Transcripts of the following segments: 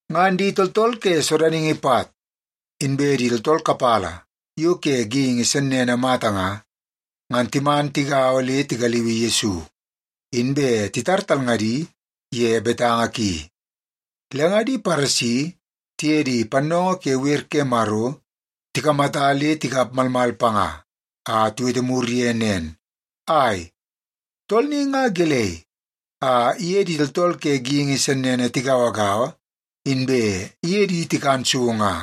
Ngan di tooltool ke sodaningi pat, inbe di tooltool kapala yo ke geingi sennene mata nga, ngan timan tigaua le tigaliui Yesu, inbe titar talngadi ye betanga ki. Le nga di Paresi tiye di pannoongoo ke wer ke Maro tikamata le tikap malmal panga a tiwete mur ye nen, “Ai, tool ni nga gelei a iye di tooltool ke geingi sennene tigauagaua, inbe iye di tikan so nga?”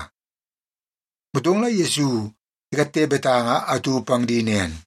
Motong la Yesu ikatte betanga atu pang di nen,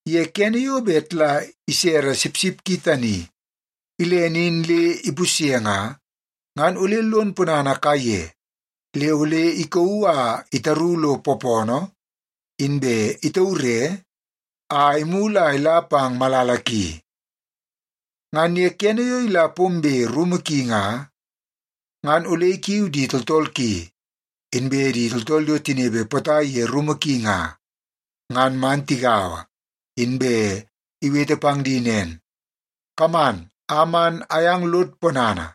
Ye kene yo bet la isere sipsip ki tani ilene in le ipusye nga, ngan ole lon ponana kaiye le ole ikauu a itaru lo poopoonoo, inbe itaure a imulu a ila pang malala ki. Ngan ye kene yo ila pombe rumu ki nga, ngan ole ikiu di tooltool ki, inbe di tooltool yo tinepe potai ye rumu ki nga, ngan man tigaua, inbe iwete pang di nen, ‘Kaman a man ayang lod ponana,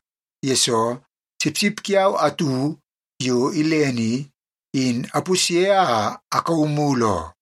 yesoo sipsip kiau atu yo ilene i, in apusye a akauu mulu oo.’”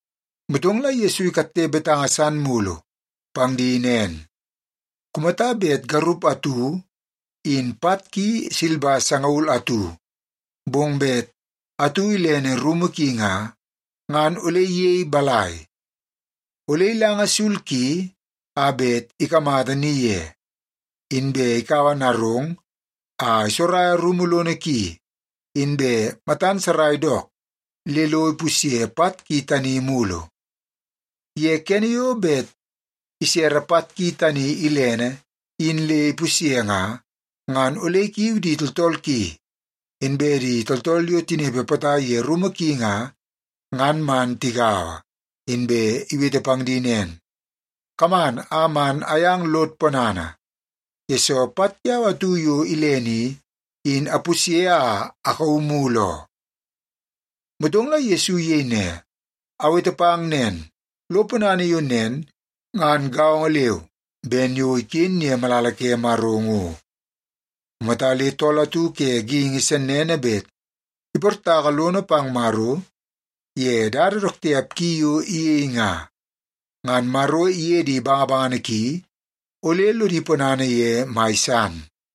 Motong la Yesu ikatte betanga san mulu pang di nen, “Kumata bet garup atu in pat ki silba sangaul atu, bong bet atu ilene rumu ki nga, ngan ole iyei balai? Ole ilanga sul ki a bet ikamata ni ye, inbe ikaua narong a isoraia rumu lono ki, inbe matan sarai dook le lo ipusye pat ki tani mulu. Ye kene yo bet isere pat ki tani ilene in le ipusye nga, ngan ole ikiu di tooltool ki, inbe di tooltool yo tinepe potai ye rumu ki nga, ngan man tigaua, inbe iwete pang di nen, ‘Kaman a man ayang lod ponana, yesoo pat kiau atu yo ilene i, in apusye a akauu mulu oo.’” Motong la Yesu iyei ne, “Awete pang nen, lo ponana yo nen ngan gaongo leu ben yo iken ye malala ke Maro ngo. Kumata le tool atu ke geingi sennene bet iportaka lono pang Maro ye dada dook tiap ki yo iyei nga, ngan Maro iye di bangabangana ki ole lodi ponana ye mai san.”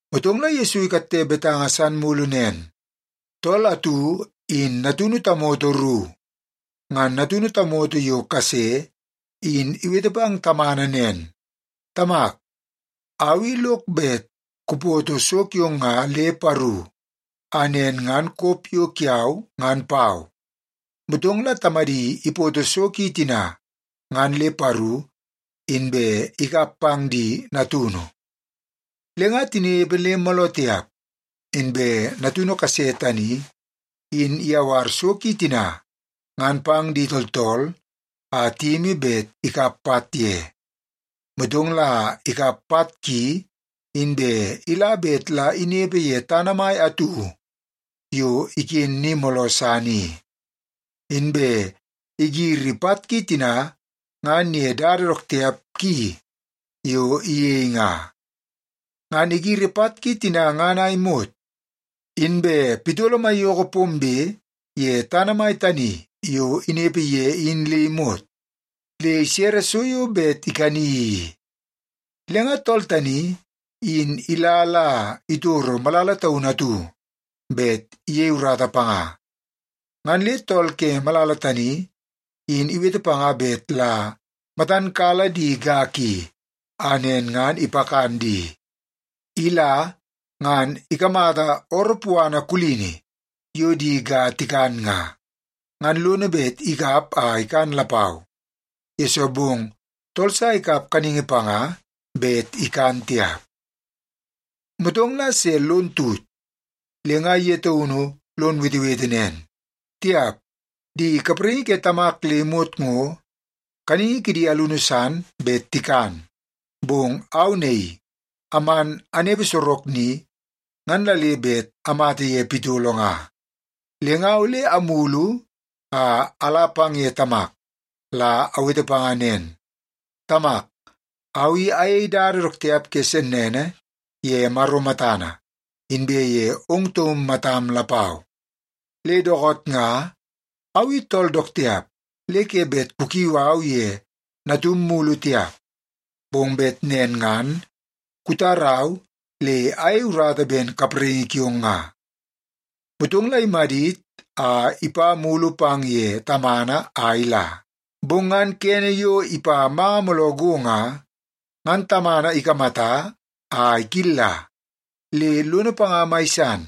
Motong la Yesu ikatte betanga san mulu nen, “Tool atu in natunu tamoto ru. Ngan natunu tamoto yo kase in iwete pang tamana nen, ‘Tamak, au i lok bet kupoto so kiong nga le paru a nen ngan kop yo kiau ngan pau.’ Motong la tamadi ipoto so ki tina ngan le paru, inbe ikap pang di natunu. “Le nga tinepe le mooloo tiap, inbe natunu kase tani in iyawar so ki tina ngan pang di tooltool a tiyimi bet ikap pat ye. Motong la ikap pat ki, inbe ila bet la inepe ye tana mai atu yo iken ni mooloo san i. Inbe igiri pat ki tina ngan ye dada dook tiap ki yo iyei nga. Ngan igiri pat ki tina ngan a imot, inbe pitolo maiyoko pombe ye tana mai tani yo inepe ye in le imot, le isere so yo bet ikani i. Le nga tool tani in ila la itoro malala taunu atu bet iyei urata panga. Ngan le tool ke malala tani in iwete panga bet la matan kala di ga ki, a nen ngan ipakan di. Ila, ngan ikamata ooroo puana kulini yo di ga tikan nga, ngan lono bet ikap a ikan lapau, yesoo bong tool sa ikap kaningi panga bet ikan tiap. “Motong la se lon tut, le nga ye taunu lon wetewete nen, ‘Tiap, di kapraingi ke tamak le imot ngo kaningi kidi alunu san bet tikan, bong au naii aman anepe sorok ni, ngan la le bet amata ye pitolo nga! Le nga, ole amulu a ala pang ye tamak, la awete panga nen, “Tamak, au i ayei dada dook tiap ke sennene ye Maro matana, inbe ye ong taum matam lapau. Le dookoot nga, au i tool dook tiap le ke bet kukiu au ye natum mulu tiap, bong bet nen ngan kutarau le ayei urata ben kapraingi kiong nga.” ’ Motong la imadit a ipa mulu pang ye tamana a ila. “Bong ngan kene yo ipa manga mooloo go nga, ngan tamana ikamata a ikilla, le lono panga mai san.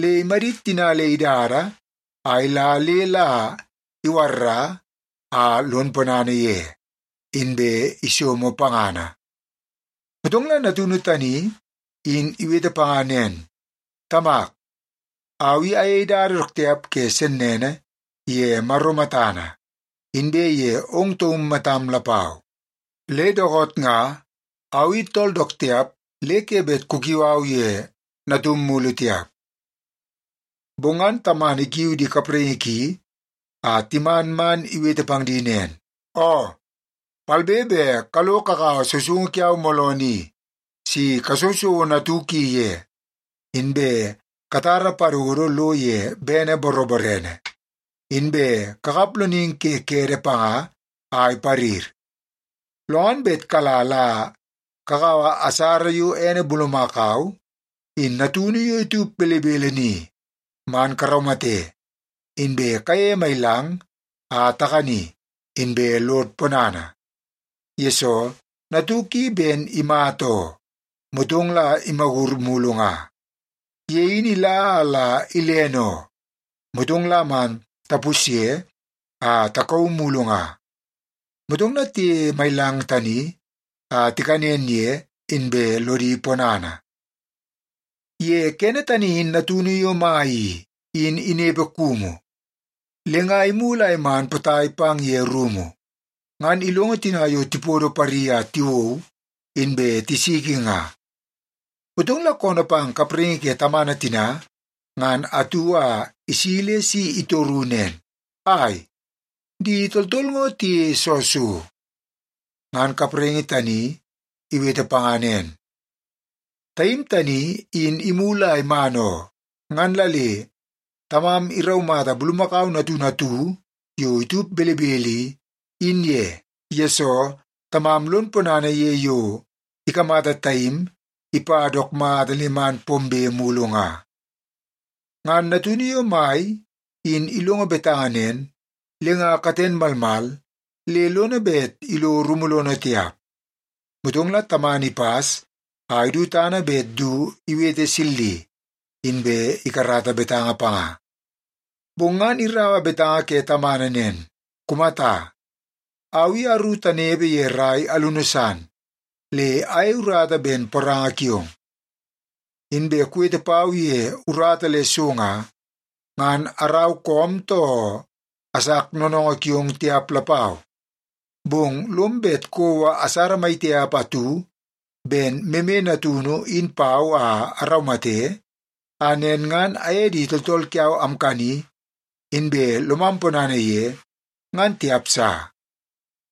Le imadit tina le idada a ila le la iwarra a lon ponana ye, inbe isomo pangana. “Motong la natunu tani in iwete panga nen, ‘Tamak, au i ayei dada dook tiap ke sennene ye Maro matana inbe ye ong taum matam lapau. Le dookoot nga, au i tool dook tiap le ke bet kukiu au ye natum mulu tiap.’ “Bong ngan tamana ikiu di kapraingi ki a timan man iwete pang di nen, ‘Oo, palbe be kalo kakaua sousoungu kiau mooloo ni si kasousouo natuk i ye, inbe katara padodo lo ye bene boroborene, inbe kakap loningi ke kede panga a iparir. Lo ngan bet kala la kakaua asara yo ene bulumakau in natunu yo itup belebele ni, man karaumate, inbe kayeie mailang a takani, inbe lod ponana, yesoo natuk i ben imata oo, motong la imagur mulu nga. Ye in ila a la ilene oo, motong la man tapusye a takauu mulu nga.’ Motong la tiyeie mailang tani a tikanen ye, inbe lodi ponana. “Ye kene tani in natunu yo mai i, in inepe kumu. Le nga imulu a iman potai pang ye rumu, ngan ilongo tina yo tipodo pari a tiwou, inbe tisiki nga. Motong la koonoo pang kapraingi ke tamana tina ngan atu a isi le si itoru nen, ‘Ai, di tooltool ngo tiyeie soo so?’ “Ngan kapraingi tani iwete panga nen, ‘Taim tani in imulu a iman oo, ngan la le tamam iraumata bulumakau natunu atu yo itup belebele i, in ye, yesoo tamam lon ponana ye yo ikamata taim ipa dook mata le man pombe mulu nga.’ “Ngan natunu yo mai in ilongo betanga nen, le nga katen malmal le lono bet ilo rumu lono tiap. Motong la tamana ipas a idu tana bet du iwete silli, inbe ikarata betanga panga. Bong ngan iraua betanga ke tamana nen, ‘Kumata, au i aru tanepe ye rai alunu san, le ayei urata ben poranga kiong. Inbe kuwete pau ye urata le so nga, ngan arau koom, too asak noonoongoo kiong tiap lapau. Bong lom bet kouo asara maitiap atu ben meme natunu in pau a araumate, a nen ngan aye di tooltool kiau amkani, inbe lomam ponana ye, ngan tiap sa.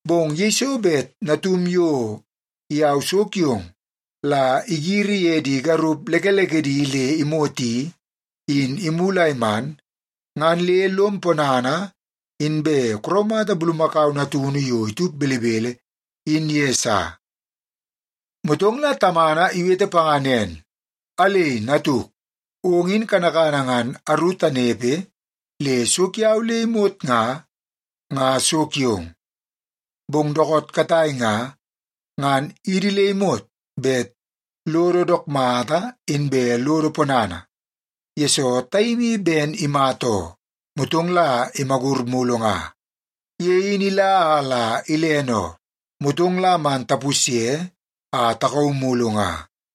Bong yeiso bet natum yo iyau so kiong la igiri ye di garup lekelekedi le imot i, in imulu a iman, ngan le lom ponana, inbe kuraumata bulumakau natunu yo itup belebele in ye sa.’ “Motong la tamana iwete panga nen, ‘Alei, natuk! Ong in kanakana ngan aru tanepe le so kiau le imot nga, nga so kiong. Bong dookoot katai nga, ngan idi le imot bet lodo dook mata inbe lodo ponana, yesoo taim i ben imata oo, motong la imagur mulu nga. Ye in ila a la ilene oo, motong la man tapusye a takauu mulu nga.’”